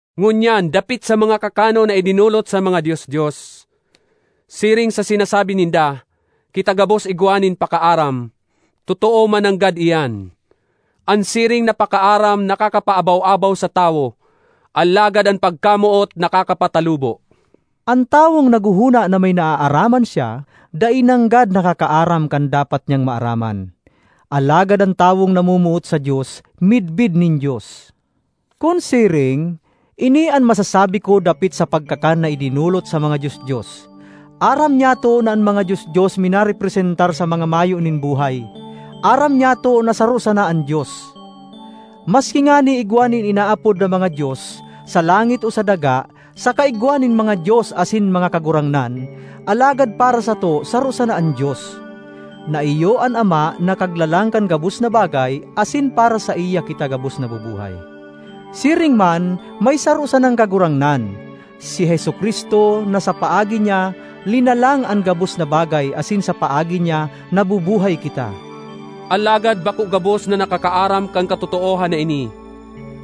Ngunyan dapit sa mga kakanon na idinolot sa mga dios-dios. Siring sa sinasabi ninda, “Kita gabos igwa nin pakaaram,” totoo man nanggad iyan. An siring na pakaaram nakakapaabaw-abaw sa tawo, alagad an pagkamoot nakakapatalubo. An tawong naghohona na may naaaraman siya, dai nanggad nakakaaram kan dapat niyang maaraman. Alagad an tawong namomoot sa Dios midbid nin Dios. Kun siring, ini an masasabi ko dapit sa pagkakan na idinolot sa mga dios-dios: aram nyato na an mga dios-dios minarepresentar sa mga mayo nin buhay; aram nyato na saro sana an Dios. Maski ngani igwa nin inaapod na “mga dios,” sa langit o sa daga, saka igwa nin “mga dios” asin “mga kagurangnan,” alagad para sato saro sana an Dios, na iyo an Ama na Kaglalang kan gabos na bagay asin para saiya kita gabos nabubuhay. Siring man may saro sanang Kagurangnan, si Jesu-Cristo, na sa paagi niya linalang an gabos na bagay asin sa paagi niya nabubuhay kita. Alagad bako gabos nakakaaram kan katotoohan na ini.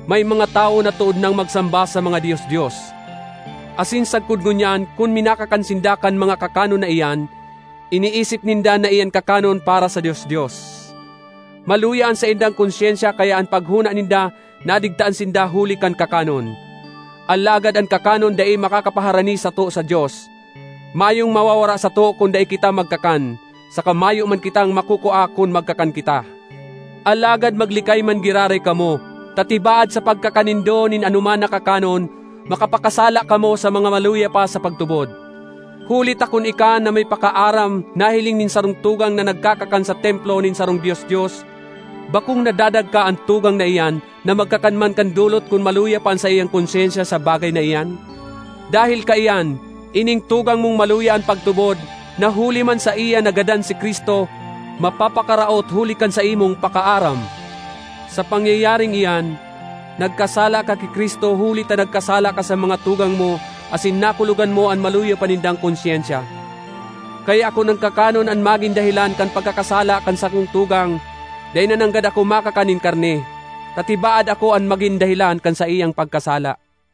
May mga tawo na tood nang magsamba sa mga dios-dios, asin sagkod ngunyan kun minakakan sinda kan mga kakanon na iyan, iniisip ninda na iyan kakanon para sa dios-dios. Maluya an saindang konsyensya kaya an paghona ninda nadigtaan sinda huli kan kakanon. Alagad an kakanon dai makakapaharani sato sa Dios; mayong mawawara sato kun dai kita magkakan, saka mayo man kitang makukua kun magkakan kita. Alagad maglikay man giraray kamo ta tibaad sa pagkakan nindo nin anoman na kakanon makapakasala kamo sa mga maluya pa sa pagtubod. Huli ta kun ika na may “pakaaram” nahiling nin sarong tugang na nagkakakan sa templo nin sarong dios-dios, bakong nadadagka an tugang na iyan na magkakan man kan dolot kun maluya pa an saiyang konsyensya sa bagay na iyan? Dahel kaiyan, ining tugang mong maluya an pagtubod, na huli man saiya nagadan si Cristo, mapapakaraot huli kan saimong “pakaaram”! Sa pangyayaring iyan, nagkasala ka ki Cristo huli ta nagkasala ka sa mga tugang mo asin nakulogan mo an maluya pa nindang konsyensya. Kaya kun an kakanon an magin dahelan kan pagkakasala kan sakong tugang, dai na nanggad ako makakan nin karne, ta tibaad ako an magin dahelan kan saiyang pagkasala.